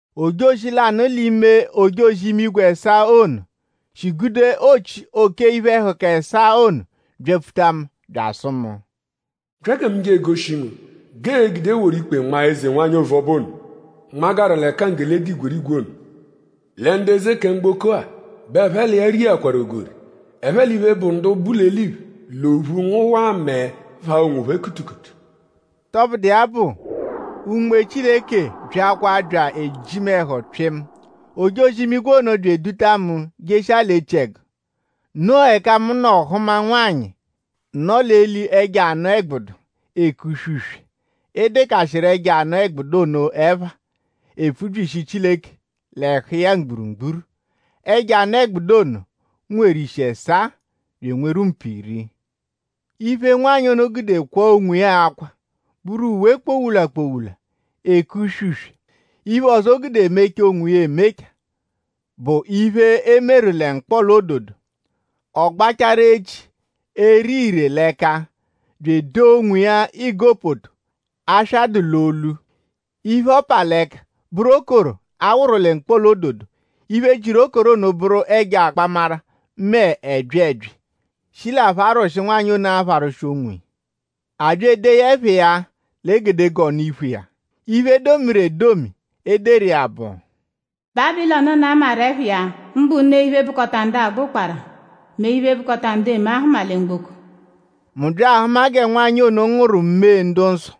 Ojozi lanụ l'ime ojozi-imigwe ẹsaa ono, shi gude ochi oke iphe-ẹhuka ẹsaa ono byapfuta mu; bya asụ mu: “Bya gẹ mu je egoshi ngu g'ee-gude woru ikpe nmaa eze-nwanyị ovuọba ono, nmagaru l'ẹka nggele dụ igwerigwe ono. Lẹ ndu eze kẹ mgboko-a bẹ ẹphe l'iya riakwaru ogori. Ẹphe l'iphe, bụ ndu bu l'eliphe l'ophu ngụwaa mẹe phaa onwophẹ kutukutu.” Tọbudu iya bụ; Unme Chileke byakwa bya eji mu ẹhu pyịmu. Ojozi-imigwe ono bya eduta mu jeshia l'echiẹgu. Noo ẹka mu nọ hụma nwanyị, nọ l'eli ẹjo anụ-ẹgbudu, eke uswe-uswe. E dekashia ẹjo anụ-ẹgbudu ono ẹpha, epfubyishi Chileke l'ẹhu iya mgburugburu. Ẹjo anụ-ẹgbudu ono nweru ishi ẹsaa bya enweru mpu iri. Iphe, nwanyị ono gude kwaa onwiya akwa bụru uwe kpowula-kpowula, eke uswe-uswe. Iphe ọzo, o gude memachaa onwiya emema bụ iphe, e meru lẹ mkpọla-ododo. Ọ gbachaaru echi, ere ire l'ẹka bya edoo onwiya igopoto, aswa dụ l'olu. Iphe, ọ pa l'ẹka bụru okoro, a wụru lẹ mkpọla-ododo. Iphe, jiru okoro ono bụru ẹjo akpamara mẹ ẹbyi ẹbyi, shi l'apharwụshi, nwanyị ono pharwụshiru onwiya. A bya edee ya ẹpha iya l'egedegee ọnu-iphu iya. Iphe, e domiru edomi e deru iya bụ: “Bábilọnu ono, a maru ẹpha iya; mbụ ne iphe, bụkota ndu agba ụkpara mẹ iphe, bụkota ndu eme ahụma lẹ mgboko.” Mu bya ahụma gẹ nwanyị ono ngụwaru mee ndu-nsọ;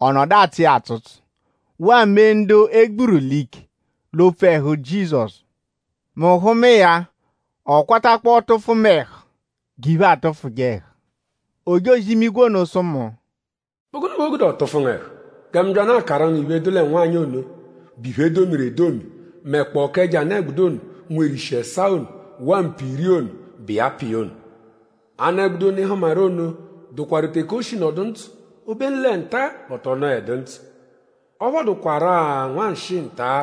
ọ nọdu atsụ iya atsụtsu; waa mee ndu e gburu l'ike l'opfu ẹhu Jizọsu. Mu hụma iya; ọ kwatakpọo tụfu mu ẹhu g'iphe atụfuje ẹhu. Ojozi-imigwe ono sụ mu: “?Bụ gụnu bẹ o gude ọ tụfu ngu ẹhu? Gẹ mu byanụ akaru ngu iphe, dụ lẹ nwanyị ono, bụ iphe, e domiru edomi; mẹkpoo k'ẹjo anụ-ẹgbudu ono, nweru ishi ẹsaa ono waa mpu iri ono, bụ iya pa iya ono. Anụ-ẹgbudu ono, ị hụmaru ono dụkwaru teke o shi nọdu ndzụ; obenu lẹ nta-a bẹ ọ tọ nọedu ndzụ. Ọ phọduakwaru-a nwanshịi nta-a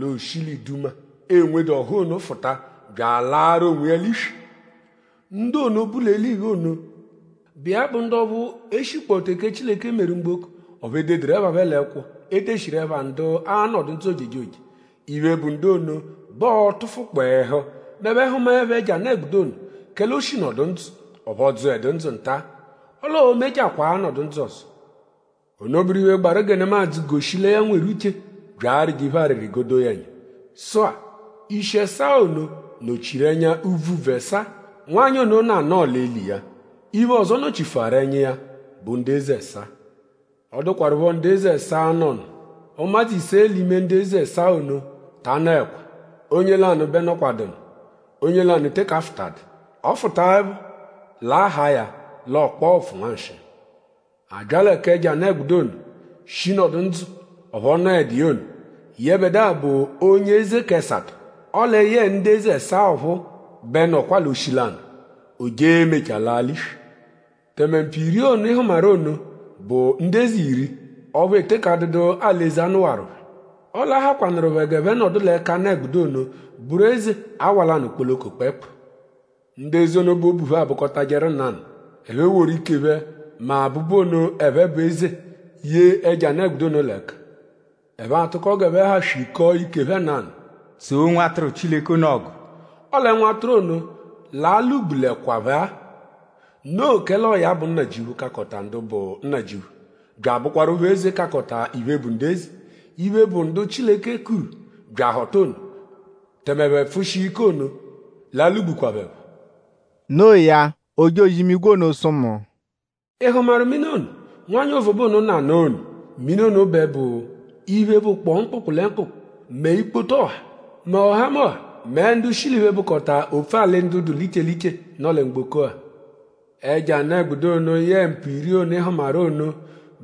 l'o shi l'iduma, enwedu ọ́hú ono fụta bya alaarụ onwiya l'iswi. Ndu ono, bu l'eliphe ono, bụ iya bụ ndu ọphu e shikpọ teke Chileke meru mgboko; ọphu e deduru ẹpha phẹ l'ẹkwo, e deshiru ẹpha ndu a-nọ ndzụ ojejoje; iphe, bụ ndu ono bẹ ọo-tụfukpo ẹhu m'ẹphe -hụmaepho ẹjo anụ-ẹgbudu ono; kẹle o shi nọdu ndzụ; ọphu ọ dzụedu ndzụ nta; ọle oo-mechakwaa nọdu ndzụ ọzo. “Ono bụru iphe, gbaru gẹ nemadzụ goshi lẹ ya nweru uche bya arịje iphe arịri g'o doo ya ẹnya. Sụ-a; ishi ẹsaa ono nọ-chiru ẹnya úbvú úbvú ẹsaa, nwanyị ono nọ anọo l'eli iya. Iphe ọzo, ọ nọ-chifuaru ẹnya iya bụ ndu eze ẹsaa. Ọ dụkwarupho ndu eze ẹsaa, nọ nụ. Ụmadzu ise l'ime ndu eze ẹsaa ono ta anọekwa. Onye lanụ bẹ nọkwadu nụ; onye lanụ teke afụtadu. Ọ -fụtaepho; l'a haa ya l'ọ kpọo ụpfu nwanshịi. A bya lẹ k'ẹjo anụ-ẹgbudu ono, shi nọdu ndzụ; ọphu ọ nọedu iya ono; yẹbedua bụ onye eze k'ẹsato; ọle yẹe ndu eze ẹsaa ọphuu bẹ nọkwa l'oshi lanụ; o je emechaa laa l'iswi. “Tẹme mpu iri ono, ị hụmaru ono bu ndu eze iri; ọphu e teke adụdu alị-eze, a nụwaru phẹ. Ọle a hakwanụru phẹ g'ẹphe nọdu l'ẹka anụ-ẹgbudu ono bụru eze awa lanụ kpoloko kpẹekpu. Ndu eze ono bẹ obu phẹ abụkotajeru nanụ. Ẹphe eworu ike phẹ mẹ abụbu ono, ẹphe bụ eze ye ẹjo anụ-ẹgbudu ono l'ẹka. Ẹphe a-tụko g'ẹphe ha swikọo ike phẹ nanụ; tsoo Nwatụru Chileke ono ọgu. Ọle Nwatụru ono l'a-lwụ-gbulekwa phẹ-a. Noo kẹle ọo ya bụ Nnajịuphu, kakọta ndu bụ nnajịuphu; bya abụkwarupho Eze, kakọta iphe bụ ndu eze. Iphe, bụ ndu Chileke kuru bya ahọta ono; tẹme ẹphe pfụshia ike ono l'a-lwụ-gbukwa phẹ phọ.” No iya; ojozi-imigwe ono sụ mu: “?Ị hụmaru mini ono, nwanyị ovuọba ono nọ anọo ono; mini ono bẹ bụ iphe, bụkpoo mkpụkpu lẹ mkpụkpu; mẹ ikpoto ọha mẹ ọhamoha mẹ ndu shi l'iphe, bụkota opfu-alị ndu dụ iche l'iche, nọ lẹ mgboko-a. Ẹjo anụ-ẹgbudu ono yẹe mpu iri ono, ị hụmaru ono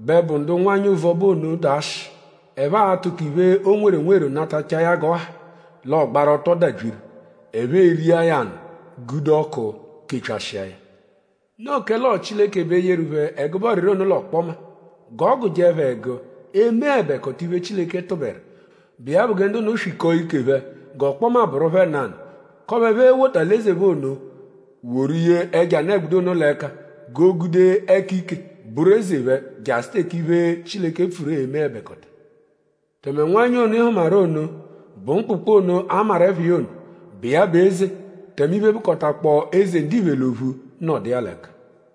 bẹ bụ ndu nwanyị ovuọba ono dụ ashị. Ẹphe a-tụko iphe, o nweru enweru natachaa ya g'ọ ha; l'ọ gbaru ọto dabyiru. Ẹphe eria ya anụ; gude ọku kepyashịa ya. Noo kẹle ọo Chileke bẹ yeru phẹ ẹgube ọriri ono l'ọkpoma; g'ọ gụje phẹ ẹgu emeẹbekota iphe, Chileke tụberu, bụ iya bụ gẹ ndu ono swikọo ike phẹ; g'ọkpoma bụru phẹ nanụ; k'ọphu ẹphe e-wota alị-eze phẹ ono woru ye ẹjo anụ-ẹgbudu ono l'ẹka g'o gude ẹka-ike bụru eze phẹ jasụ teke iphe, Chileke pfuru e-meẹbekota. “Tẹme nwanyị ono, ị hụmaru ono bụ mkpụkpu ono, a maru ẹpha iya ono, bụ iya bụ eze; tẹme iphe, bụkotakpoo eze ndiphe l'ophu nọdu iya l'ẹka.”